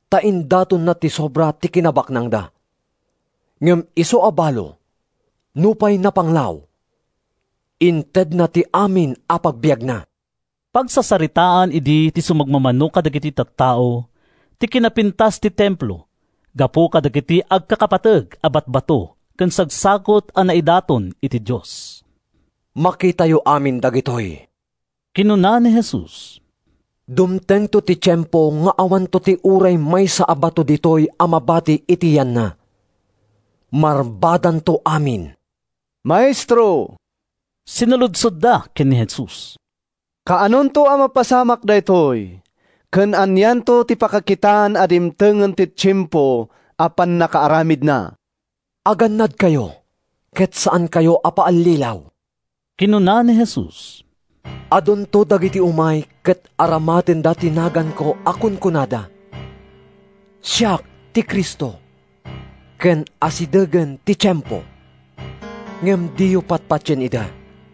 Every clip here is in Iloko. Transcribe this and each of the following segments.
Ta indatonda ti sobra ti kinabaknangda. Ngem isu a balo, nupay napanglaw, intedna ti amin a pagbiagna.” Pagsasaritaan idi ti sumagmamano kadagiti tattao ti kinapintas ti Templo gapu kadagiti agkakapateg a batbato ken sagsagut a naidaton iti Dios. “Makitayo amin dagitoy,” kinuna ni Jesus. “Dumtengto ti tiempo nga awanto ti uray maysa a bato ditoy a mabati iti yanna. Marbadanto amin!” “Maestro,” sinaludsodda ken ni Jesus, “kaanonto a mapasamak daytoy? Ken anianto ti pakakitaan a dimtengen ti tiempo a pannakaaramidna?” “Agannadkayo ket saankayo a paallilaw,” kinuna ni Jesus. “Adunto dagiti umay ket aramatenda ti naganko a kunkunada, ‘Siak ti Cristo,’ ken ‘Asidegen ti tiempo!’ Ngem diyo patpatien ida.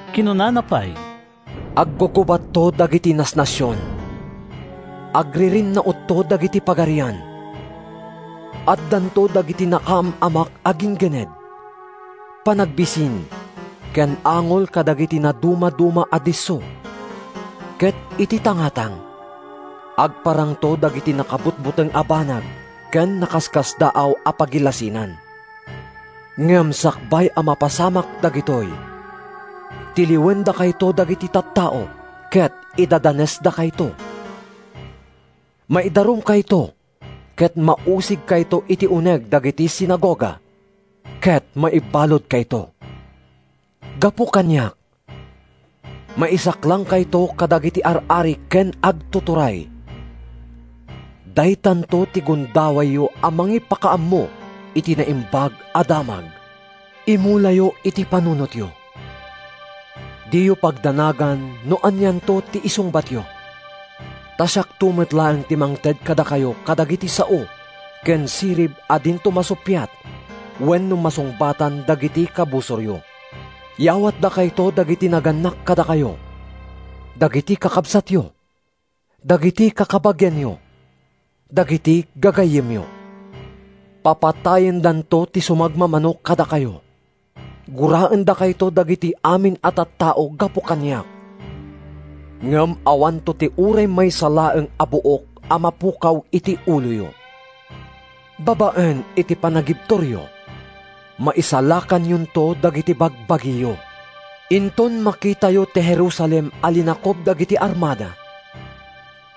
Kinunana pay, “Aggugubatto dagiti nasnasion. Agririnnautto dagiti pagarian. Addanto dagiti nakaam-amak a ginggined, panagbisin ken angol kadagiti nadumaduma a disso, ket iti tangatang agparangto dagiti nakabutbuteng a banag ken nakaskasdaaw a pagilasinan. “Ngem sakbay a mapasamak dagitoy, tiliwendakayto dagiti tattao ket idadanesdakayto. Maidarumkayto ket mausigkayto iti uneg dagiti sinagoga, ket maibaludkayto. Gapu kaniak, maisaklangkayto kadagiti ar-ari ken agtuturay. Daytanto ti gundawayyo a mangipakaammo iti Naimbag a Damag. Imulayo iti panunotyo: Diyo pagdanagan no anianto ti isungbatyo. Ta siakto met laeng ti mangted kadakayo kadagiti sao ken sirib a dinto masuppiat wenno masungbatan dagiti kabusoryo. Yawatdakayto dagiti nagannak kadakayo, dagiti kakabsatyo, dagiti kakabagianyo, dagiti gagayyemyo. Papatayendanto ti sumagmamano kadakayo. Guraendakayto dagiti amin a tattao gapu kaniak, ngem awanto ti uray maysa laeng a buok a mapukaw iti uloyo. Babaen iti panagibturyo, maisalakanyonto dagiti bagbagiyo.” “Inton makitayo ti Jerusalem a linakub dagiti armada,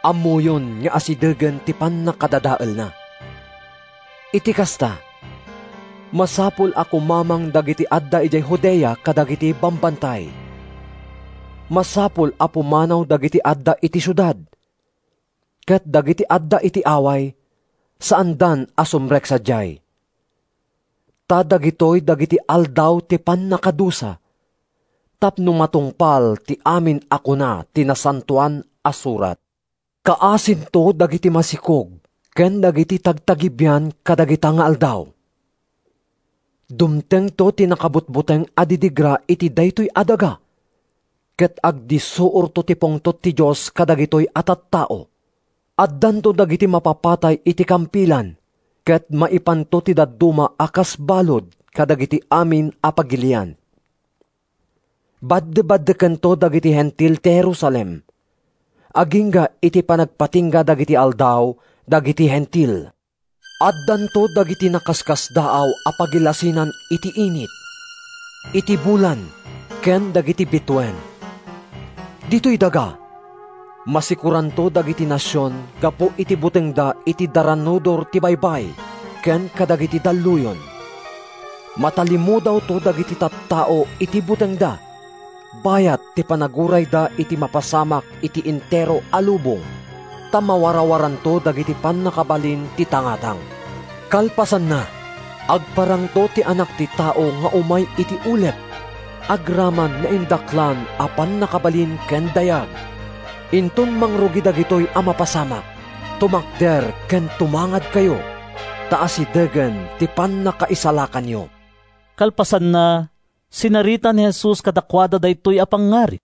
ammoyon nga asidegen ti pannakadadaelna. Iti kasta, masapul a kumamang dagiti adda idiay Judea kadagiti bambantay. Masapul a pumanaw dagiti adda iti siudad, ket dagiti adda iti away saandan a sumrek sadiay. Ta dagitoy ‘Dagiti Aldaw ti Pannakadusa,’ tapno matungpal ti amin a kuna ti Nasantoan a Surat. Kaasinto dagiti masikog ken dagiti tagtagibian kadagita nga aldaw! Dumtengto ti nakabutbuteng a didigra iti daytoy a daga, ket agdissuorto ti pungtot ti Dios kadagitoy a tattao. Addanto dagiti mapapatay iti kampilan ket maipanto ti dadduma a kas balud kadagiti amin a pagilian. Baddebaddekento dagiti Hentil ti Jerusalem, agingga iti panagpatingga dagiti aldaw dagiti Hentil.” “Addanto dagiti nakaskasdaaw a pagilasinan iti init, iti bulan ken dagiti bituen. Ditoy daga, masikoranto dagiti nasion gapu iti butengda iti daranudor ti baybay ken kadagiti dalluyon. Matalimudawto dagiti tattao iti butengda bayat ti panagurayda iti mapasamak iti entero a lubong, ta mawarawaranto dagiti pannakabalin ti tangatang. Kalpasanna, agparangto ti Anak ti Tao nga umay iti ulep agraman naindaklan a pannakabalin ken dayag. Inton mangrugi dagitoy a mapasamak, tumakder ken tumangadkayo, ta asidegen ti pannakaisalakanyo.” Kalpasanna, sinarita ni Jesus kadakuada daytoy a pangngarig.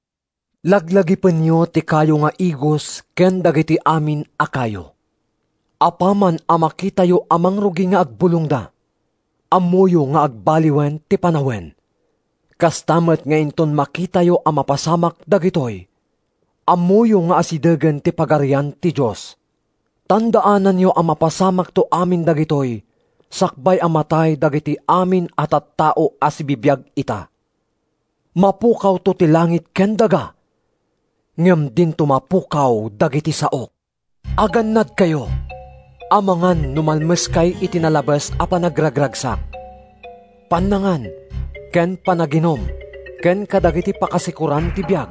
“Laglagipenyo ti kayo nga igos ken dagiti amin a kayo. Apaman a makitayo a mangrugi nga agbulongda, ammoyo nga agbaliwen ti panawen. Kasta met nga inton makitayo a mapasamak dagitoy, ammoyo nga asidegen ti Pagarian ti Dios. “Tandaananyo a mapasamakto amin dagitoy sakbay a matay dagiti amin a tattao a sibibiag ita. Mapukawto ti langit ken daga, ngem dinto mapukaw dagiti saok.” “Agannadkayo amangan no malmeskay iti nalabes a panagragragsak, pannangan, ken panaginum ken kadagiti pakasikoran ti biag,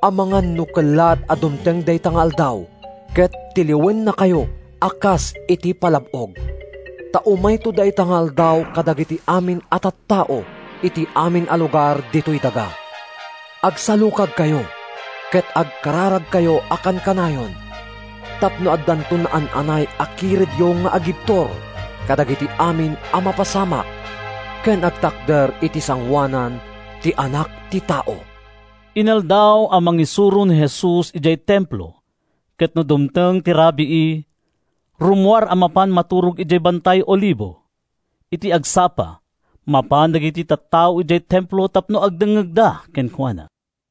amangan no kellaat a dumteng dayta nga Aldaw ket tiliwennakayo a kas iti palab-og. Ta umayto dayta nga aldaw kadagiti amin a tattao iti amin a lugar ditoy daga. Agsalukagkayo ket agkararagkayo a kankanayon tapno addanto naan-anay a kiredyo nga agibtur kadagiti amin a mapasamak, ken agtakder iti sangoanan ti Anak ti Tao.” Inaldaw a mangisuro ni Jesus idiay Templo ket no dumteng ti rabii, rummuar a mapan maturog idiay Bantay Olivo. Iti agsapa, mapan dagiti tattao idiay Templo tapno agdengngegda kenkuana.